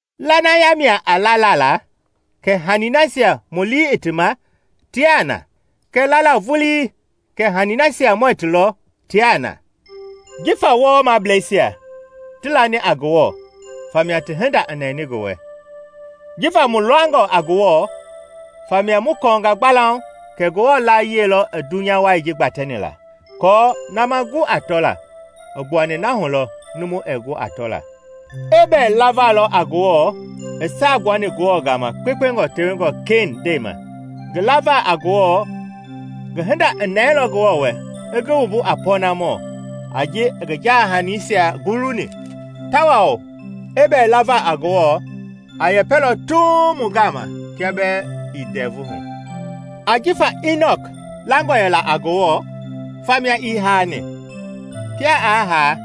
Lanaya mia a lala la kɛ hani nasia mu lii i ti ma tiaa na, kɛɛ lala vulii kɛ hanii nasia muɛɛ ti lɔ tiaa na. Jifa wɔwɔmablɛisia ti lani a Ngewɔ famia ti hinda i nɛni ngi wɛ. Jifa mu langɔ a Ngewɔ famia mu kɔɔnga gbalauŋ kɛ Ngewɔ laayiɛi lɔ i dunya wai ji gbatɛni la, aako na ma gu a tɔla i gbuani na hu lɔ numu ɛɛ gu a tɔla. Ebɛl lava lɔ a Ngewɔ i saa gbuani Ngewɔ ma kpekpengɔ tewengɔ Ken ndɛi ma. Ngi lava a Ngewɔ, ngi hinda i nɛilɔ Ngewɔ wɛ i ngi wumbu a pɔɔnamɔ a ji i ngi jaa-hanisia guluni. Tawao Ebɛl lava a Ngewɔ, a yɛpɛlɔ tuuŋ mu gama kia bɛɛ ii ndɛvu hu. Jifa Inɔk langɔ yɛla a Ngewɔ famia ii haani. Kia aa haa,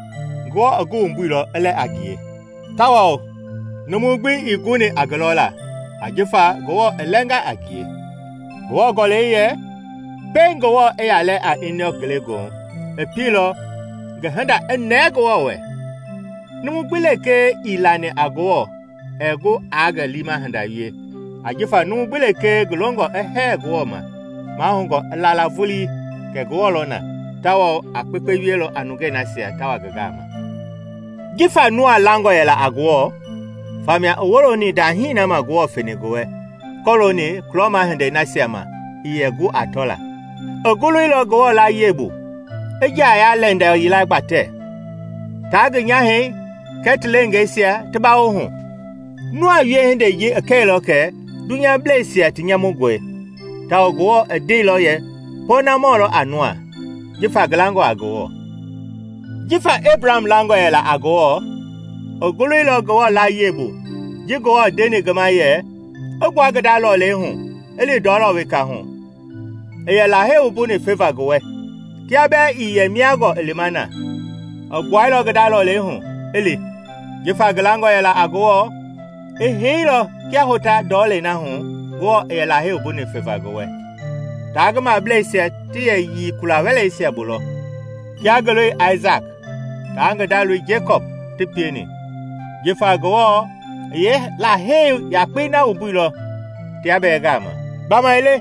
Ngewɔ i ngi wumbuilɔ i lɛ a ngie, tawao numu gbi ii guni a ngi lɔla, ajifa Ngewɔ i lɛnga a ngie. Ngewɔ Gɔlɛi yɛ pɛiŋ Ngewɔ i yaa lɛ a Inɔk ngelegoohu, i pieilɔ ngi hinda i nɛɛ Ngewɔ wɛ. Numu gbi lekee ii lani a Ngewɔ ɛɛ gu aa ngi liima hinda wie, ajifa numu gbi lekee ngi longɔ i hɛɛ Ngewɔ ma, mahoungɔ i la la vulii kɛ Ngewɔ lɔ na tawao a kpekpe wielɔ a nungei nasia ta wa ngi gama. Jifa Noa langɔ yɛla a Ngewɔ famia i woloni ndahii na ma Ngewɔ feni ngi wɛ kɔlooni kulɔma hindei nasia ma ii yɛ gu a tɔla. I goloilɔ Ngewɔ laayiɛi bu, i nja-ya-lɛndɛ yila gbatɛ, taa ngi nyahɛi kɛɛ ti leengeisia ti bawo hu. Noa wiehindei ji i kɛilɔ kɛ dunyableisia ti nyamungɔe, tawao Ngewɔ i ndeilɔ yɛ pɔɔnamɔ lɔ a Noa jifa ngi langɔ a Ngewɔ. Jifa Ebraham langɔ yɛla a Ngewɔ, i goloilɔ Ngewɔ laayiɛi bu ji Ngewɔ i ndeni ngi ma yɛ i gbua ngi nda lɔlei hu i li ndɔlɔ weka hu i yɛ Lahei wumbuni feva ngi wɛ. Kia bɛɛ ii yɛ mia gɔɔ i lima na, i gbuailɔ ngi nda lɔlei hu, i li. Jifa ngi langɔ yɛla a Ngewɔ, i heilɔ kia hota ndɔlei na hu Ngewɔ i yɛ Lahei wumbuni feva ngi wɛ. Taa ngi mablɛisia ti yɛ yii kula-wɛleisia bu lɔ, kia ngi loi Aisaki taa ngi nda loi Jekɔpi ti pieni, jifa Ngewɔ i yeelahei yakpei na wumbuilɔ tia bɛɛ gaama. Gbamaile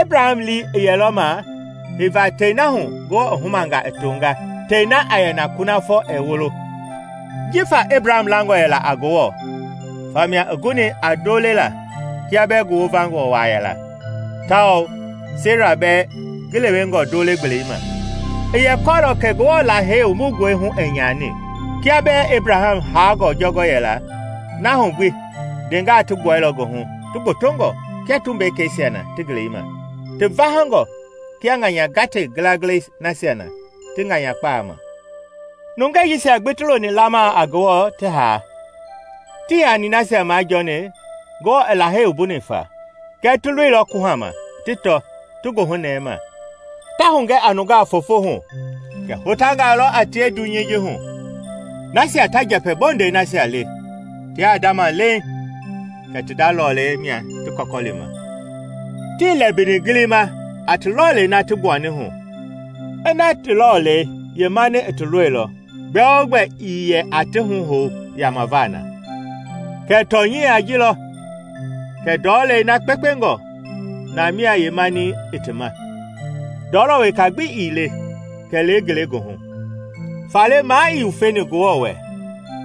Ebraham lii i yɛlɔ ma heiva tɛi na hu Ngewɔ i humanga i tonga, tɛi na a yɛ na kunafɔ ɛɛ wolo. Jifa Ebraham langɔ yɛla a Ngewɔ famia i guni a ndo lela kia bɛɛ ngi wovangɔ waa yɛla tawao Sera bɛɛ ngi lewengɔ ndole gbelei ma. I yɛ kɔɔlɔ kɛ Ngewɔ Lahei wumbungɔi hu ɛɛ nyani. Kia bɛɛ Ebraham haangɔ jɔngɔ yɛla, na hu gbi ndeengaa ti gbuailɔ ngi hu ti gbotongɔ kia tumbekeisia na ti ngelei ma, ti vahangɔ kia ŋanya gate ngilangilɛi nasia na ti ŋanyakpaa ma. Nungɛi jisia gbi ti loni lamaa a Ngewɔ ti haa. Tii hani nasia majɔɔni Ngewɔ i Lahei wumbuni fa, kɛɛ ti loilɔ kuhama ti tɔ ti goohunɛɛ ma, ta hugɛ a nungaa foofo hu kɛ hotangaa lɔ a tie dunyei ji hu. Nasia ta njɛpɛ bondɛi nasia le tiaa ndama leiŋ kɛ ti nda lɔlei mia ti kɔkɔlima. Tii lɛmbini gilima a ti lɔlei na ti gbuani hu; ina ti lɔlei yeemani i ti lɔilɔ, gbɛogbɛ ii yɛ aa ti huhou yamava na. Kɛɛ tɔnyɛi a ji lɔ kɛ ndɔlei na kpekpengɔ na mia yeemani i ti ma, ndɔɔlɔ weka gbi ii le kɛlee ngelegoohu. Faale na ii wufeni Ngewɔ wɛ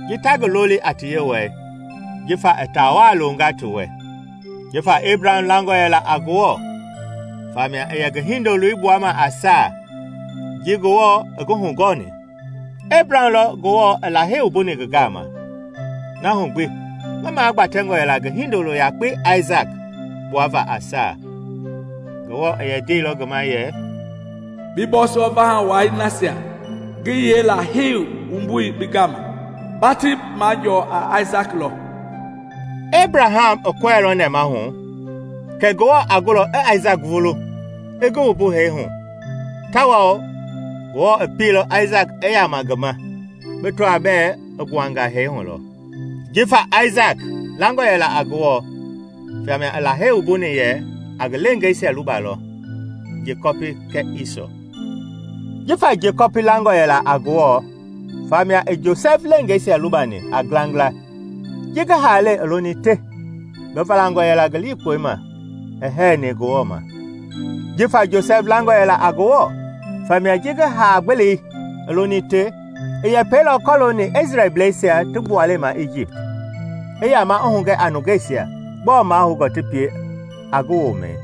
ji ta ngi loli a ti Yewɔɛi, jifa i taa waa loonga ti wɛ. Jifa Ebraham langɔ yɛla a Ngewɔ famia i yɛ ngi hindoloi gbuama a saa, ji Ngewɔ i ngi hugɔɔni. Ebraham lɔ Ngewɔ i Lahei wumbuni ngi gama, na hu gbi ngi magbatɛngɔ yɛla ngi hindolo yakpei Aisaki gbuava a saa. Ngewɔ i yɛ ndeilɔ ngi ma yɛ, “Bi bɔɔsɔ vaha wai nasia ngi yeelahei wumbuni bi gaama, ba ti majɔɔ a Aisaki lɔ.” Ebraham i kɔɛilɔ nɛmahu kɛ Ngewɔ a gulɔ i Aisaki vulu i ngi wumbu hee hu tawao Ngewɔ i pieilɔ Aisaki i yama ngi ma bi tɔaa bɛɛ i gbuanga hee hu lɔ. Jifa Aisaki langɔ yɛla a Ngewɔ famia i Lahei wumbuni yɛ a ngi leengeisia luba lɔ, Jekɔpi kɛɛ Isɔ. Jifa Jekɔpi langɔ yɛla a Ngewɔ famia i Josɛfi leengeisia lubani a ngilangila ji ngi haalɛi i loni te. Ngi valangɔ yɛla ngi likpɔi ma i hɛɛni Ngewɔ ma. Jifa Josɛfi langɔ yɛla a Ngewɔ famia ji ngi haa-gbelei i loni te, i yɛpɛilɔ kɔlooni Isrɛelblɛisia ti gbualei ma Ijipt, i yama i hugɛ a nungeisia gbɔɔ mahoungɔ ti pie a ngi womɛi.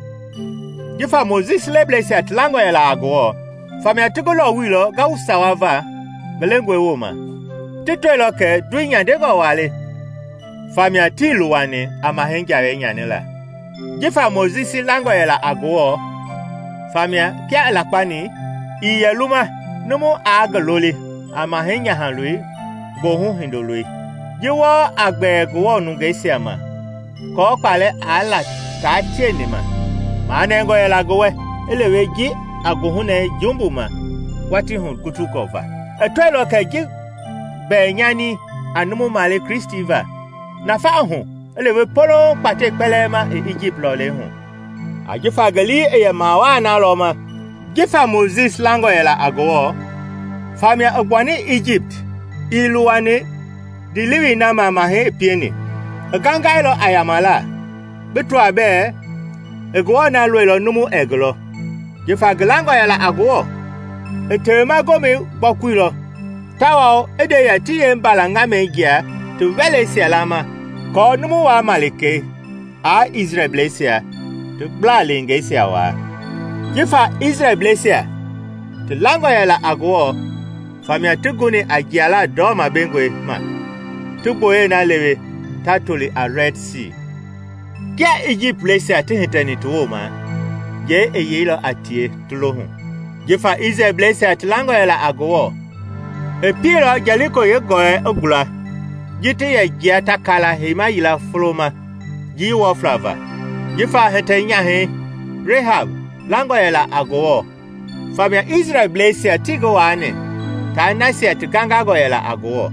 Jifa Mojisi leblɛisia ti langɔ yɛla a Ngewɔ famia ti ngi lɔwuilɔ ngawu sawa va ngi lengɔi wooma. Ti tɔilɔ kɛ ndoi nyandengɔ waa le famia tii luwani a mahɛi jawei nyanila. Jifa Mojisi langɔ yɛla a Ngewɔ famia kia i lakpani, ii yɛ luma numu aa ngi loli a mahɛi nyahaloi goohu hindoloi. Ji wɔɔ a gbɛɛ Ngewɔ nungeisia ma kɔɔ kpaalɛ i la taa tieni ma, manɛngɔ yɛla ngi wɛ i lewe ji a goohunɛɛ jumbu ma watii hugutungɔ va. I tɔilɔ kɛ ji mbɛnyani a numu maale Kristi va, nafa i hu i lewe polouŋ kpatɛi kpɛlɛɛ ma i Ijipt lɔlei hu, ajifa ngi lii i yɛ mawaa na lɔ ma i wama sɔɔma kulɔma. Jifa Mojisi langɔ yɛla a Ngewɔ famia i gbuani Ijipt ii luwani ndiilewei na ma mahɛi i pieni; i gangailɔ a yamala, bi tɔa bɛɛ i Ngewɔ na lɔilɔ numu ɛɛ ngi lɔ. Jifa ngi langɔ yɛla a Ngewɔ, i Tewema Gomɛi gbɔkuilɔ tawao i nde yɛ ti yeembala ŋamɛi jia ti wɛleisia lama aako Numu-waa malikei aa Isrɛelblɛisia ti gbla-lengeisia waa. Jifa Isrɛelblɛisia ti langɔ yɛla a Ngewɔ famia ti guni a jiala ndɔma bengɔi ma ti gbooyɛi na lewe ta toli a Rɛd Sii; kia Ijiptblɛisia ti hitɛni ti wooma, njɛi i yeilɔ a tie ti lo hu. Jifa Isrɛelblɛisia ti langɔ yɛla a Ngewɔ, i pieilɔ Jɛliko yeegɔlɔi i gula ji ti yɛ jia ta kaala heima yila folo ma njii wɔfla va. Jifa hitɛ-nyahɛi Rehab langɔ yɛla a Ngewɔ famia Isrɛlbleisia tii ngi waani taa nasia ti gangangɔ yɛla a Ngewɔ,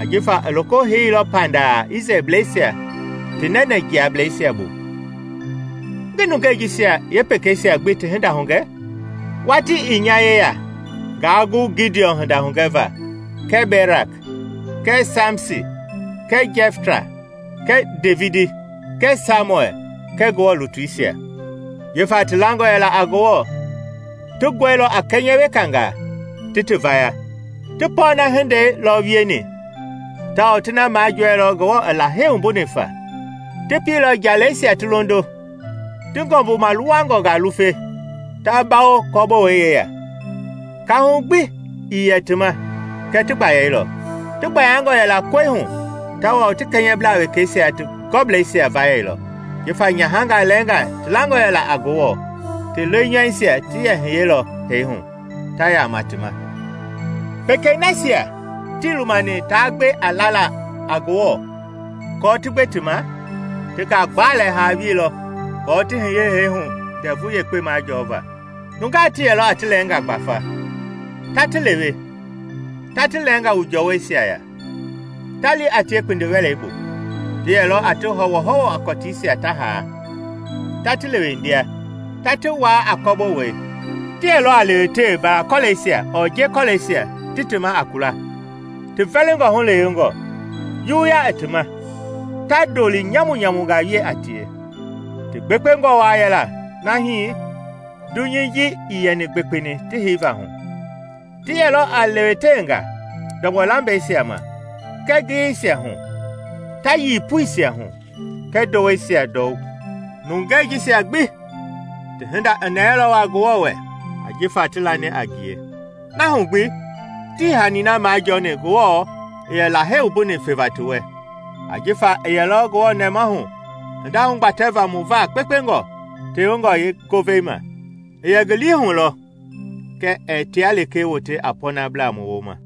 ajifa i loko heiilɔ pandaa Isrɛlbleisia ti nɛnɛjiagablɛisia bu. Ngi nungei jisia yeepekeisia gbi ti hinda hugɛ? Watii ii nya yeya ngaa gu Gidiɔn hinda hugɛva kɛɛ Berak kɛɛ Samisi kɛɛ Jɛfta kɛɛ Devidi kɛɛ Samuɛl kɛɛ Ngewɔ lutuisia. Jifa ti langɔ yɛla a Ngewɔ, ti gɔilɔ a kɛnyɛ wekangaa ti ti vaya. Ti pɔɔna hindei lɔ wieni tawao ti na majɔɛilɔ Ngewɔ i Lahei wumbuni fa. Ti pieilɔ njalɛisia ti londo, ti ngɔmbu maaluwangɔngaa lufe, ta bawo kɔbowei yeya. Kaahu gbi ii yɛ ti ma kɛɛ ti gbayailɔ; ti gbayangɔ yɛla kɔi hu tawao ti kɛnyɛblaa wekeisia ti gɔblɛisia vayɛilɔ. Jifa nyahangaa lɛɛnga ti langɔ yɛla a Ngewɔ, ti lenyɔuisia ti yɛ hiyelɔ hee hu ta yama ti ma. Pekei nasia tii lumani taa gbe a laala a Ngewɔ aako ti gbe ti ma, ti ngagbalɛ haa wieilɔ aako ti hiye hee hu ndɛvu yekpe majɔɔva. Nungaa ti yɛlɔ a ti lɛɛngaa gbafa, ta ti lewe, ta ti lɛɛngaa wu jɔɔwɔisia ya, ta li a tie kpindi-wɛlei bu. Ti yɛlɔ a ti hɔwɔhɔwɔ a kɔtiisia ta haa, ta ti lewendia, ta ti waa a kɔbowei. Ti yɛlɔ a lewetewe mbala-kɔlɛisia ɔɔ nje-kɔlɛisia ti ti ma a kula, ti vɛlingɔ hulewengɔ, juwuya i ti ma, ta ndoli nyamunyamungaa wie a tie. Ti gbekpengɔ waa yɛla na hii dunyei ji ii yɛ gbekpeni ti heiva hu. Ti yɛlɔ a lewetewenga ndɔgbɔlambɛisia ma kɛɛ ngiyeisia hu ta yii puisia hu kɛɛ ndoweisia ndɔwu. Nungɛi jisia gbi ti hinda i nɛɛilɔ waa Ngewɔ wɛ ajifa ti lani a ngie; na hu gbi tii hani na majɔɔni Ngewɔ i yɛ Lahei wumbuni feva ti wɛ, ajifa i yɛlɔ Ngewɔ nɛmahu hinda hugbatɛva mu va kpekpengɔ tewengɔ yeengovei ma. I yɛ ngi lii hu lɔ kɛ ɛɛ tia lekee wote a pɔɔnablaa mu wooma.